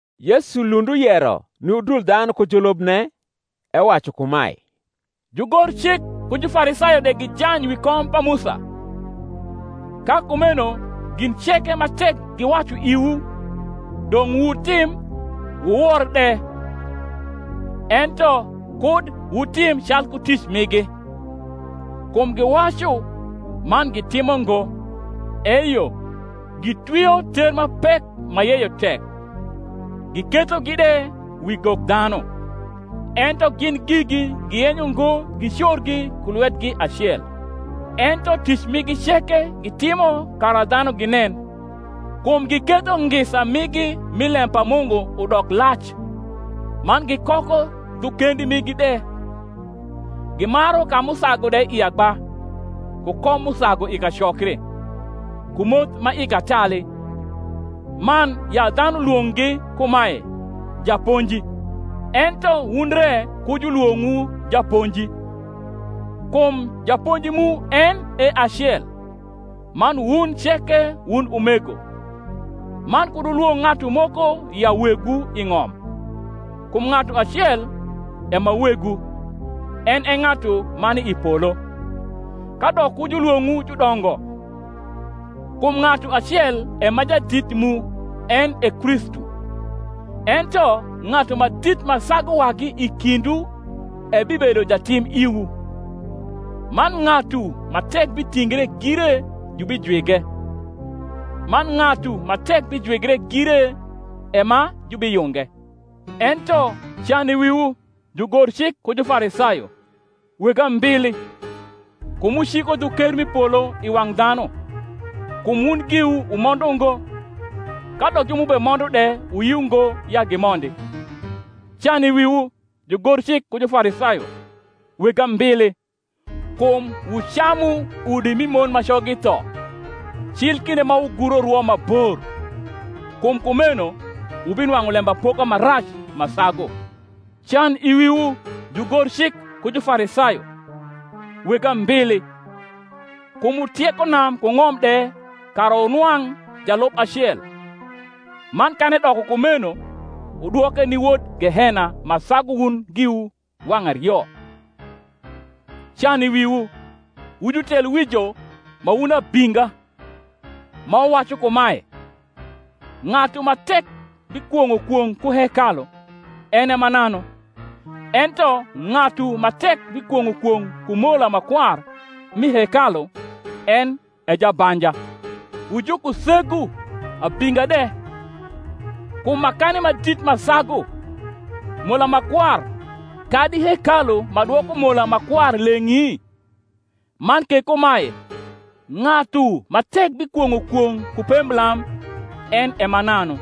Yesu lund uyero ni udul dhanu ku julubne, ewacu kumae, Jugorcik ku Jufarisayo de gijany wi kom pa Musa: ka kumeno gin ceke ma tek giwacu iwu, dong’ wutim wuwor de: ento kud wutim calku tic migi; kum giwacu, man gitimo ngo. Eyo, gitwio ter ma pek ma yeyo tek, gikethogi de wi gok dhanu; ento gin gigi giyenyo ngo gicorgi ku lwetgi acel. Ento tic migi ceke gitimo kara dhanu ginen: kum giketho ngisa migi mi lem pa Mungu udok lac, man gikoko dhu kendi migi de, gimaru ka m’usagu de i agba, ku kom m’usagu i kacokri, ku moth ma i katali, man ya dhanu lwong’gi kumae, Japonji. Ento wun re ku julwong’wu Japonji: kum japonji mu en e acel, man wun ceke wun umego. Man kud wulwong’ ng’atu moko ya wegwu i ng’om: kum ng’atu acel e ma Wegwu, en e ng’atu ma ni i polo. Kadok ku julwong’wu judongo: kum ng’atu acel e ma jadit mu, en e Kristu. Ento ng’atu ma dit ma sagu wagi i kindwu ebibedo jatim iwu. Man ng’atu ma tek bitingre gire jubijwige; man ng’atu ma tek bijwigre gire e ma jubiyunge. Ento can i wiwu, jugorcik ku Jufarisayo, weg ambili! kum wuciko dhu ker m’i polo i wang’ dhanu: kum wun giwu wumondo ngo, kadok ju m’ubemondo de wuyio ngo ya gimondi. Can i wiwu, jugorcik ku Jufarisayo, weg ambili! kum wucamu udi mi mon ma coggi tho, cil kinde ma wuguro rwo ma bor: kum kumeno wubinwang’u lembapoka ma rac ma sagu. Can i wiwu, jugorcik ku Jafarisayo, weg ambili! kum wutieko nam ku ng’om de kara wunwang’ jalub acel; man kan edoko kumeno, wudwoke ni wod gehena ma sagu wun giwu wang’ ario. Can i wiwu, wu jutelwrjo ma wun abinga, ma wuwacu kumae, Ng’atu ma tek bikwong’o kwong’ ku hekalu, en e mananu; ento ng’atu ma tek bikwong’o kwong’ ku mola ma kwar mi hekalu, en e jabanja. Wu jukusegu abinga de: kum makani ma dit ma sagu, mola ma kwar kadi hekalu ma dwoko mola ma kwar leng’i? Man ke kumae, Ng’atu ma tek bikwong’o kwong’ ku pemblam, en e mananu;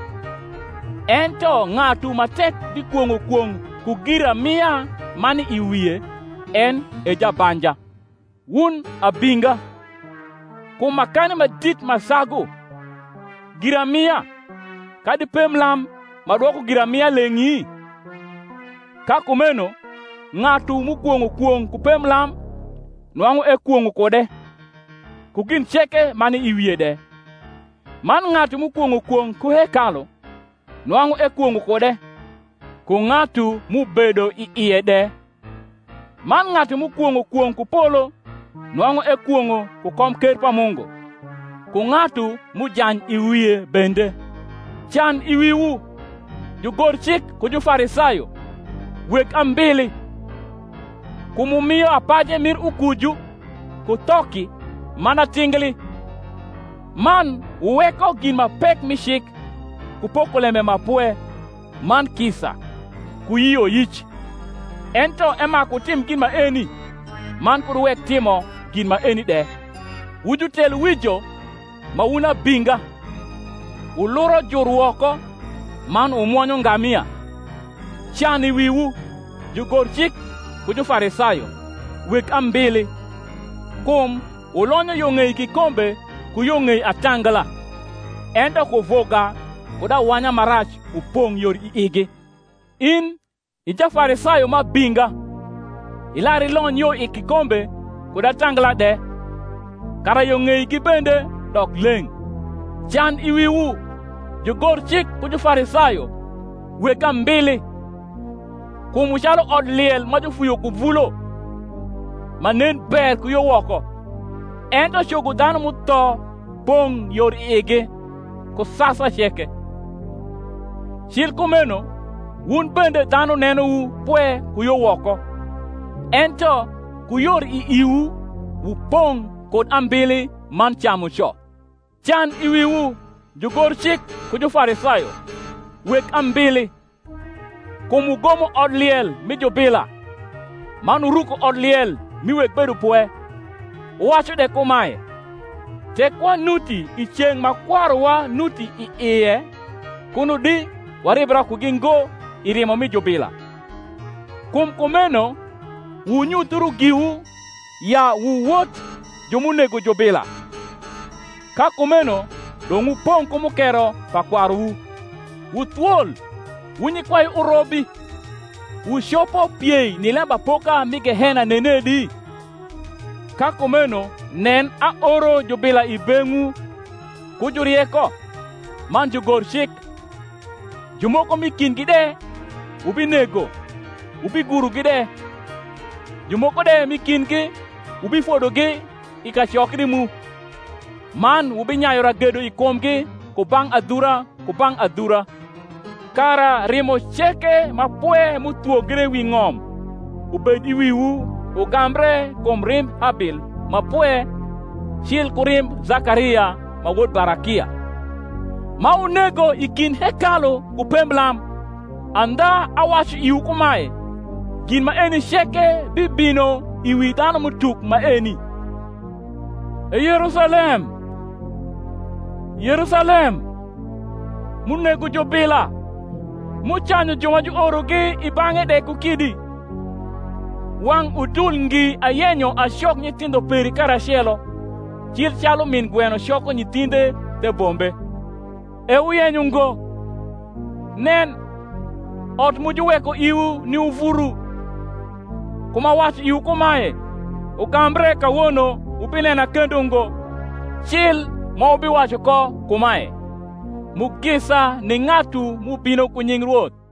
ento ng’atu ma tek bikwong’o kwong’ ku giramia ma ni i wie, en e jabanja. Wun abinga: kum makani ma dit ma sagu, giramia, kadi pemblam ma dwoko giramia leng’i? Ka kumeno ng’atu m’ukwong’o kwong’ ku pemblam, nwang’u ekwong’o kude, ku gin ceke ma ni i wie de. Man ng’atu m’ukwong’o kwong’ ku hekalu, nwang’u ekwong’o kude, ku ng’atu m’ubedo i ie de. Man ng’atu m’ukwong’o kwong’ ku polo, nwang’u ekwong’o ku komker pa Mungu, ku ng’atu m’ujany i wie bende. Can i wiwu, jugorcik ku Jufarisayo, weg ambili! kum wumio apaje mir ukuju, ku thoki, man atingli, man wuweko gin ma pek mi cik, ku pokolembe ma pwe, man kisa, ku yioyic: ento emaku wutim gin maeni, man kud wuwek timo gin maeni de. Wujutelwijo ma wun abinga, wuluro jur woko, man wumwonyo ngamia! Can i wiwu, jugorcik ku Jufarisayo, weg ambili! kum wulonyo yo ng’ei kikombe ku yo ng’ei atangla, ento kuvuga kud awanya ma rac upong’ yor i igi. In i Jafarisayo ma abinga, ilar ilony yo i kikombe kud atangla de, kara yo ng’eigi bende dok leng’. Can i wiwu, jugorcik ku Jufarisayo, weg ambili! kum wu calu odliel ma jufuyo ku vulo, ma nen ber ku yo woko, ento cogo dhanu m’utho pong’ yor i igi, ku sasa ceke. Cil kumeno wun bende dhanu nenowu pwe ku yo woko, ento ku yor i iwu wupong’ kud ambili man camuco. Can i wiwu, jugorcik ku Jufarisayo, weg ambili! kum wugomo odliel mi jubila, man wuruko odliel mi weg bedopwe, wuwacu de kumae, Tek wanuti i ceng’ ma kwaruwa nuti i ie, kuno di waribra kugi ngo i rimo mi jubila. Kum kumeno wunyuthiu giwu, ya wu wot ju m’unego jubila. Ka kumeno dong’ wupong’ mukero pa kwaruwu. Wu thwol, wu nyikwai urobi, wucopo piei ni lembapoka mi gehena nenedi? Ka kumeno, nen, aoro jubila i beng’wu, ku jurieko, man jugorcik: jumoko m’i kindgi de wubinego wubigurogi de; jumoko de m’i kindgi wubifodogi i kacokri mu, man wubinyayu ragedo i kumgi ku bang’ adhura ku bang’ adhura: kara rimo ceke ma pwe m’uthwogre wi ng’om, ubed i wiwu ugambre kum rimb Habil ma pwe cil ku rimb Zakaria ma wod Barakia, ma wunego i kind hekalu ku pemblam. Andha awacu iwu kumae, Gin maeni ceke bibino i wi dhanum’utuk maeni. E Yerusalem, Yerusalem, m’unego jubila, m’ucanyu ju ma juorogi i bang’e de ku kidi! wang’ udul ngi ayenyo acok nyithindho peri karacelo, cil calu rnin gweno coko nyithindhe the bombe, e wuyenyo ngo! Nen, ot mu juweko iwu ni uvuru. Kum awacu iwu kumae, Ugambre kawono wubinena kendo ngo, cil ma wubiwacu ko kumae, Mugisa ni ng’atu m’ubino ku nying Rwoth.